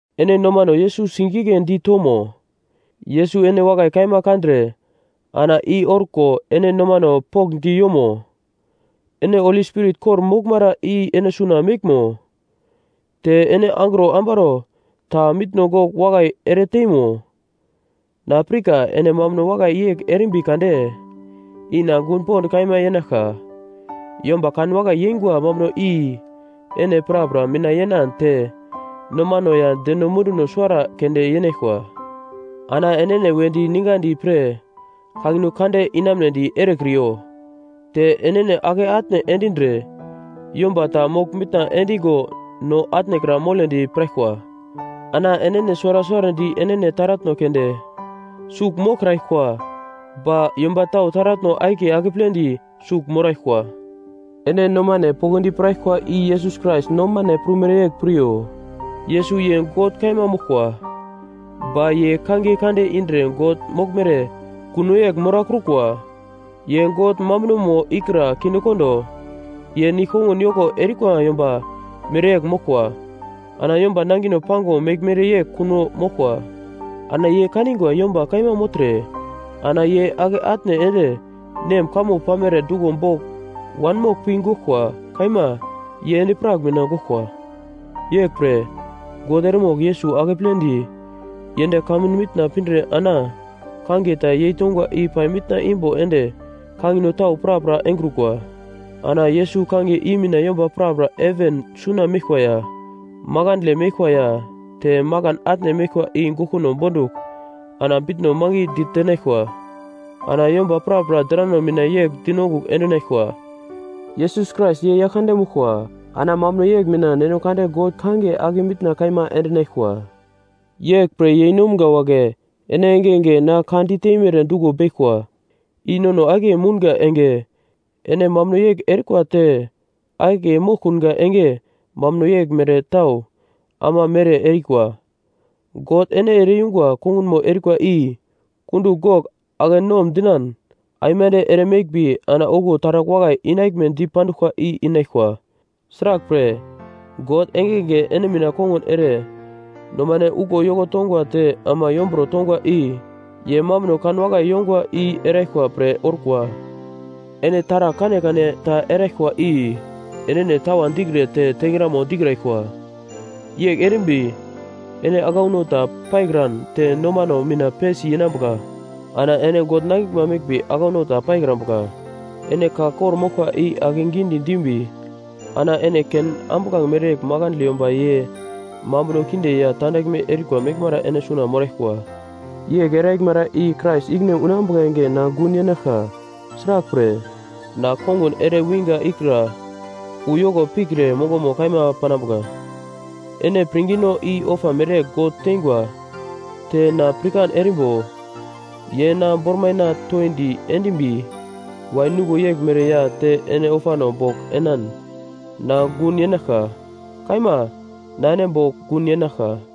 Ene nomano Yesus sigigledi tomo? Yesus ene wakai kaima kandre ana i orko ene nomano pokndi yomo? Ene Holi Spirit kor-moglmara i ene suna meglmo? Te ene angro ambaro ta mitno gogl wakai ere teimo? Na pirka ene mambuno wakai yegl erimbi kade i na gun pond kaima yenaglka. Yomba kanwakai yeingwa mambuno i ene prapra mina yenan te nomano ya deno munduno suwara keunde yenaglkwa. Ana enene wedi ningadi pre kangino kande inamunedi erekriyo. Te enene ake atne endindre yomba ta mogl mitna endingo no atnekra moledi piraglkwa. Ana enene suwara suwarandi enene taratno keunde sugl moglkraglkwa ba yomba tau taratno akiye akeple di sugl moraglkwa. Ene nomane poglodi piraglkwa i Yesus Krais nomane prumere yegl piryo: Yesus ye God kaima moglkwa, ba ye kangiye kande indre God moglmere kuno yegl morakrukwa. Ye God mambunomo ikra kindekondo, ye nigl-kongun yoko erikwa yomba mereyegl moglkwa. Ana yomba nangino pango meglmere yegl kuno moglkwa. Ana ye kaningwa yomba kaima mogltre ana yene ake atne ende Nem kamo pamere duglo bogl wanmogl pi goglkwa, kaima, ye endi-prak mina goglkwa. Yeglpre God eremogl Yesus akepledi yend kamun mitna pindre ana kangiye ta yeitongwa i pai mitna imbo ende kangino tau prapra engrukwa. Ana Yesus kangiye i mina yomba prapra heven suna meglkwa ya makandle meglkwa ya te makan atne meglkwa i goglkuno bondugl, ana bitno mangi ditenaglkwa. Ana yomba prapra drano mina yegl dinongugl endinaglkwa, “Yesus Krais ye Yaglkande moglkwa” ana mambuno yegl mina Neno Kande God kangiye ake mitna kaima endinaglkwa. Yeglpre, yeinomga wagle, ene engenge na ka di teimere duglo beglkwa, i nono akiye mounga enge ene mambuno yegl erikwa te akiye moglkunga enge mambuno yegl mere tau ama mere erikwa. God ene ere-yungwa kongunmo erikwa i kundugl gogl ake nom dinan aimande ere meglmbi ana okuwo taragl wakai inaglme di panduglkwa i inaglkwa. Sraglpre, God engenge ene mina kongun ere nomane uglo yoko tongwa te ama yomburo tongwa i ye mambuno kan wakai yongwa i eraglkwa pre orkwa. Ene taragl kanekane ta eraglkwa i enene tawa dikre te tengramo dikraglkwa, yegl erimbi, ene aglauno ta paikran te nomano mina pesi yenambuka. Ana ene God nangiglma meglmbi aglauno ta paikrambuka. Ene ka kor-moglkwa i akegi dimbi ana ene ken ambuglange mereyegl makandle yomba ye mambuno kinde ya tandaglme erikwa meglmara ene suna moraglkwa. Yegl eraglmara i Krais ikine unambuka enge na gun yenaglka, sraglpre, na kongun ere winga ikra uyoko pikre mongomo kaima panambuka. Ene pirngino i ofa mereyegl God teingwa te na pirkan erimbo ye na bormaina toindi endimbi wain nuglo yeglmere ya te ene ofano bogl enan, na gun yenaglka. Kaima na ene bogl gun yenaglka.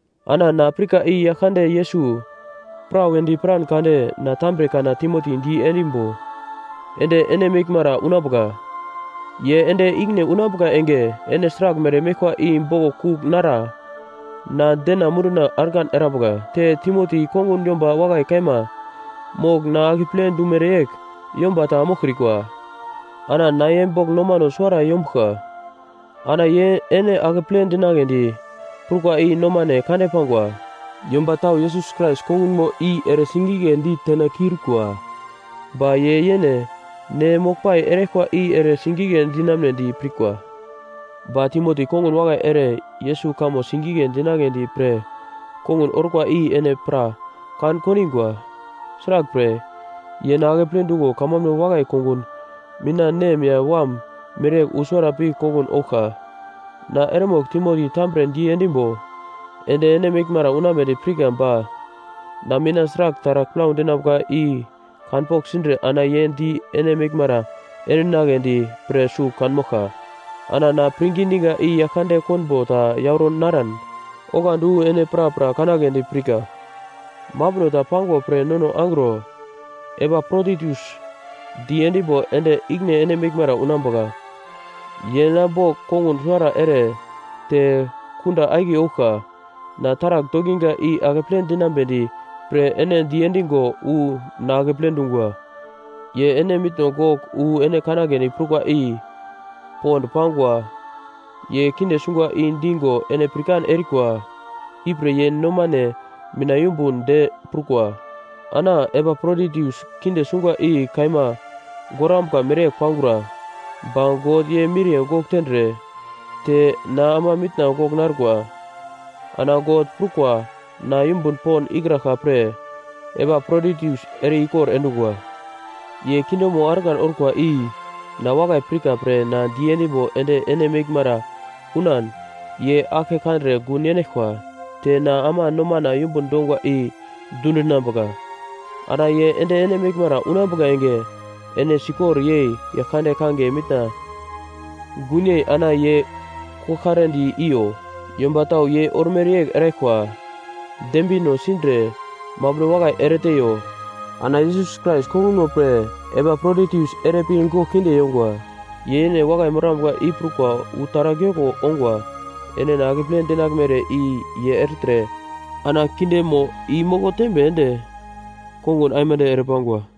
Ana na pirka i Yaglkande Yesus prawedi piran kade na tambre kana Timoti di endimbo ende ene meglmara unambuka. Ye ende ikine unambuka enge, ene sraglmere meglkwa i boglo kugl nara na dena munduna argan erambuka. Te Timoti kongun yomba wakai kaima mogl na akeple dumere yegl yomba ta moglkrikwa. Ana na ye bogl nomano suwara yombuglka, ana ye ene akeple dinagledi prukwa i nomane kande pangwa. Yomba tau Yesus Krais kongunmo i ere sigigledi tena kiurikwa, ba ye yene ne moglpai eraglkwa i ere sigigle dinamunedi pirkwa. Ba Timoti kongun wakai ere Yesus kamo sigigle dinagledi pre kongun orkwa i ene pra kan kondingwa, sraglpre, ye na akeple dungo kamambuno wakai kongun mina nem ya wam mereyegl wu suwara pi kongun ouglka. Na eremogl Timoti tambre diendimbo ende ene meglmara unambedi pirka ba na mina sragl taragl plau dinambuka i kanpogl sindre ana ye di ene meglmara endinagledi pre sugl kanmoglka. Ana na pirngi diga i Yaglkande konbo ta yauro naran oglandi wu ene prapra kanagledi pirka. Mambuno ta pangwa pre Nono angro Epaproditus diendimbo ende ikine ene meglmara unambuka, ye na bogl kongun suwara ere te kunda akiye ouglka, na taragl dokinga i akeple dinambedi pre ene diendigo wu na akeple dungwa. Ye ene mitno gogl wu ene kanagledi prukwa i pond pangwa ye kinde sungwa i digo ene pirkan erikwa, ipre ye nomane mina yumbun de prukwa. Ana Epaproditus kinde sungwa i kaima gorambuka mere pangura, ba God ye miriye gogl tendre, te na ama mitna gogl narkwa, ana God prukwa na yumbun pond ikraglka pre Epaproditus ere-ikor endungwa. Ye kindemo argan orkwa i na wakai pirka pre ana diendimbo ende ene meglmara unan ye aglke kandre gun yenaglkwa te na ama nomana yumbun dongwa i dundinambuka. Ana ye ende ene meglmara unambuka enge ene sikor yei Yaglkande kangiye mina gunyei ana ye koglkaredi iyo. Yomba tau ye ormere yegl eraglkwa dembino sindre mambuno wakai ereteiyo. Ana Yesus Krais kongunmo pre Epaproditus ere pi gogl kinde yongwa, ye yene wakai morambuka i prukwa wu taragl yoko ongwa. Ene na akeple dinaglmere i ye ertre ana kindemo i moko tembe ende kongun aimande ere pangwa.